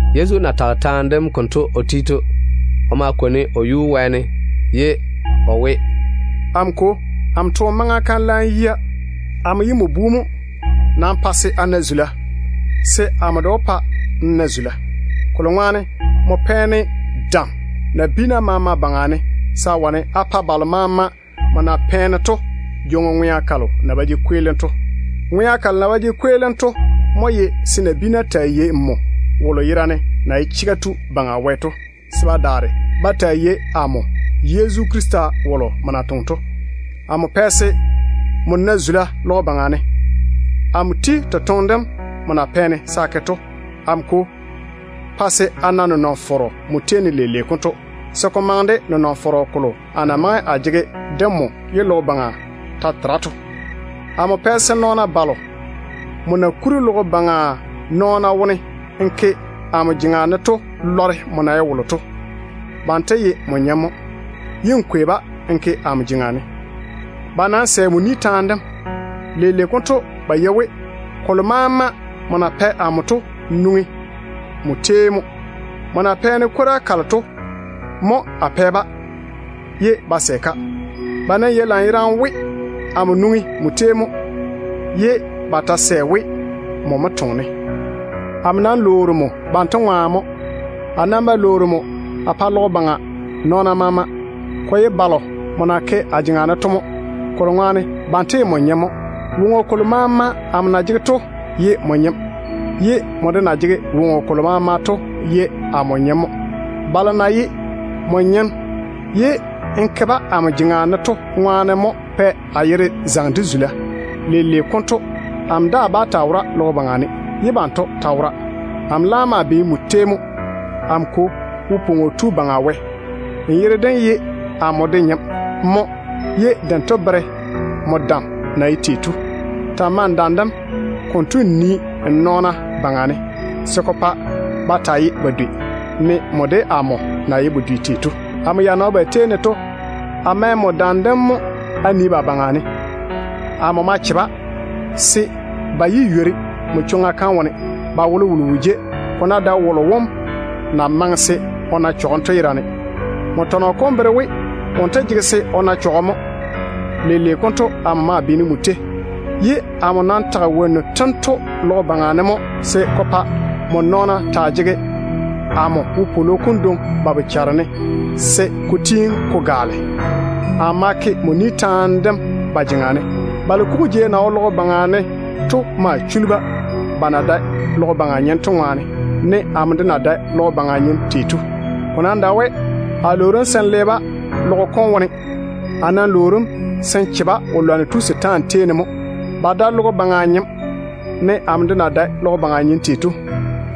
Yezu na tage taane dem konto o ti to, o ma kwoni o yuu wɛɛne ye o we: “Amo Kwo, a toone maŋa kam laam yia. Amo ye nmo Bu mo. Nam pa se a na zula, se amo de wó pa n na zula. Kolo ŋwaane nmo pɛ-ne dam nabiina maama baŋa ne se a wane a pa balo maama nmo na pɛ-ne to jwoŋi ŋwea kalo na ba jege kweelim to. Ŋwea kalo na ba jege kweelim to mo ye se nabiina taa yei nmo wolo yerane na ye chega tu Baŋa Wɛ to, se ba daare ba taa yei amo, Yezu Krista wolo nmo na toŋe to. Amo pɛ se nmo na zula logo baŋa ne, de amo na ti totoŋe dem nmo na pɛ-ne se a toŋe to. Amo Kwo, pa se a na nenɔŋ-fɔrɔ nmo tei ne leile konto, se ko maŋe de nenɔŋ-fɔrɔ kolo a na maŋe a jege de nmo ye logo baŋa ta tera to. Amo pɛ se nɔɔna balo nmo na kuri logo baŋa nɔɔna wone n ke amo jeŋa ne to lɔre nmo na ye wolo to. Banto ye nmo nyem mo, ye n kwei-ba n ke amo jeŋa ne. Ba nam sɛ nmo ni taane dem mo. Leile konto ba yei we kolo maama nmo na pɛ amo to nwoŋi nmo tei mo. Kokuri to, nmo na pɛ-ne kwora kalo to mo a pɛ-ba, ye ba sɛ. Ba nam yei lanyerane we amo nwoŋi nmo tei mo, ye ba ta sɛ we nmo mo toŋe-ne. Amo nam lwoori nmo banto ŋwaane mo, se a ba lwoori nmo a pa logo baŋa nɔɔna maama. Ko nam ye balo nmo na ke a jeŋa ne to, kolo ŋwaane banto ye nmo nyem mo. Woŋo kolo maama amo na jege to ye nmo nyem, ye nmo de na jege woŋo kolo maama to ye amo nyem mo. Balo na ye nmo nyem ye n ke-ba amo jeŋa ne to ŋwaane mo pɛ a yere zaŋe de zula. Leile konto amo daa bá taa wora logo baŋa ne, ye banto ta wora mo. Amo laam maa beene nmo tei mo. Amo Kwo, Wo-pwoŋo Tu Baŋa Wɛ, nmo yere dem ye amo de nyem mo, ye dento bere nmo dam dem na ye tei to. Ta‑n mae n dam dem konto n nii n nɔɔna baŋa ne, se ko pa ba taa ye woŋo dedoa, ne nmo de amo na ye woŋo dedoa tei to. Amo ya na wo ba tei ne to, a mɛ nmo dam dem mo a nii ba baŋa ne. Amo ma che-ba se ba yé ywori nmo chwoŋa kam wone. Ba wolowolo wo jei, ko ná dae wolo wom na maŋe se o na chɔgem to yerane. Nmo tɔnɔ kom bere we wonto jege se o na chɔgem mo. Leile konto amo maa beene nmo tei. Amo nam tage wonnu tento logo baŋa ne mo se ko pa nmo nɔɔna bam taa jege amo wopwolo kom dwoŋi ba bochara ne se ko tiini ko gaale. A ma ke nmo ni taane dem ba jeŋa ne. Balo kugu jei na wo logo baŋa ne to ma chuli-ba, ba na dae logo baŋa nyem to ŋwaane, ne amo de na dae logo baŋa nyem tei to. Ko nam dae we a lwoori nmo se n le-ba logo kom baŋa ne. A nam lwoori‑m se n che-ba wo-lwanno tu setaane jeŋa ne mo. Ba dae logo baŋa nyem, ne amo de na dae logo baŋa nyem tei to.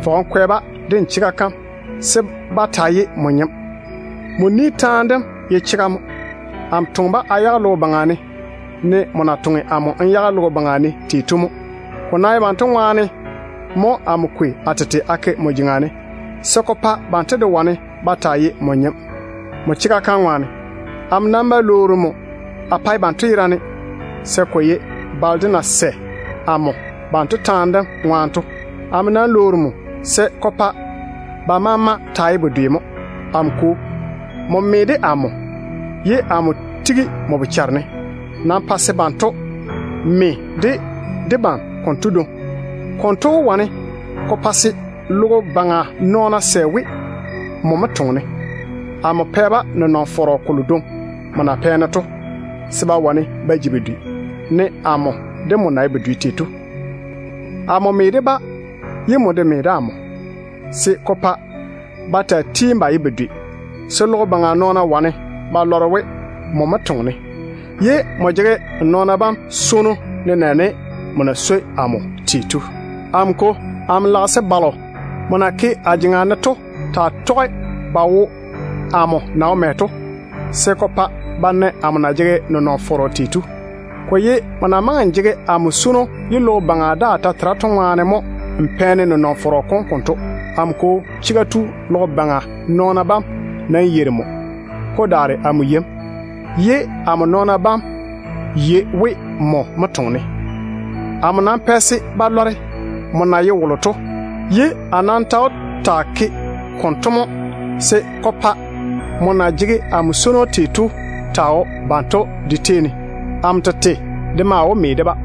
Fɔge n kwɛ-ba de n chega kam se ba taa ye nmo nyem. Nmo ni taane dem ye chega mo. Amo toŋe-ba a yage logo baŋa ne, ne nmo na toŋe amo de n yage logo baŋa ne tei to mo. Ko nam ye banto ŋwaane mo amo kwei a tete a ke nmo jeŋa ne, se ko pa banto de wane ba taa ye nmo nyem, nmo chega kam ŋwaane. Amo nam ba lwoori nmo a pae banto yerane, se ko ye balo de na wó ba ba sɛ amo banto taane dem ŋwaane to mo. Amo nam lwoori nmo se ko pa ba maama taa ye woŋo dedoa mo. Amo Kwo, nmo me de amo, ye amo tigi nmo bochare ne. Nam pa se banto me de debam konto dwoŋi. Konto wó wane ko pa se logo baŋa nɔɔna sɛ we, nmo mo toŋe-ne. Amo pɛ-ba nenɔŋ-fɔrɔ kolo dwoŋi nmo na pɛ-ne to, se ba wane ba ji woŋo dedoa, ne amo de nmo na ye woŋo dedoa tei to. Amo me de-ba, ye nmo me de amo, se ko pa ba taa tiini ba ye woŋo dedoa, se logo baŋa nɔɔna wane ba lɔre we nmo mo toŋe-ne, ye n jege nmo nɔɔna bam swono, nenɛɛne nmo na swoi amo tei to. Amo Kwo, a lage se balo nmo na ke a jeŋa ne to taa tɔge ba wo amo na wo mɛ to, se ko pa ba na amo na jege nenɔŋ-fɔrɔ kolo to. Ko ye nmo na maŋe n jege amo swono faŋa faŋa ye logo baŋa daa ta wo ke to ŋwaane mo n pɛ-ne nenɔŋ-fɔrɔ kom konto. Amo Kwo, nmo ye Chega Tu. Logo baŋa nɔɔna bam nam yeiri nmo. Ko daare amo yei nmo, ye a nɔɔna bam yei we nmo mo toŋe-ne. Amo nam pɛ se ba lɔre nmo na ye wolo to, ye a daa ta wó taa ke konto mo se ko pa swono kolo nmo na jege amo ŋwaane to taa wo banto de tei ne. Amo tete de maa wó me de-ba.”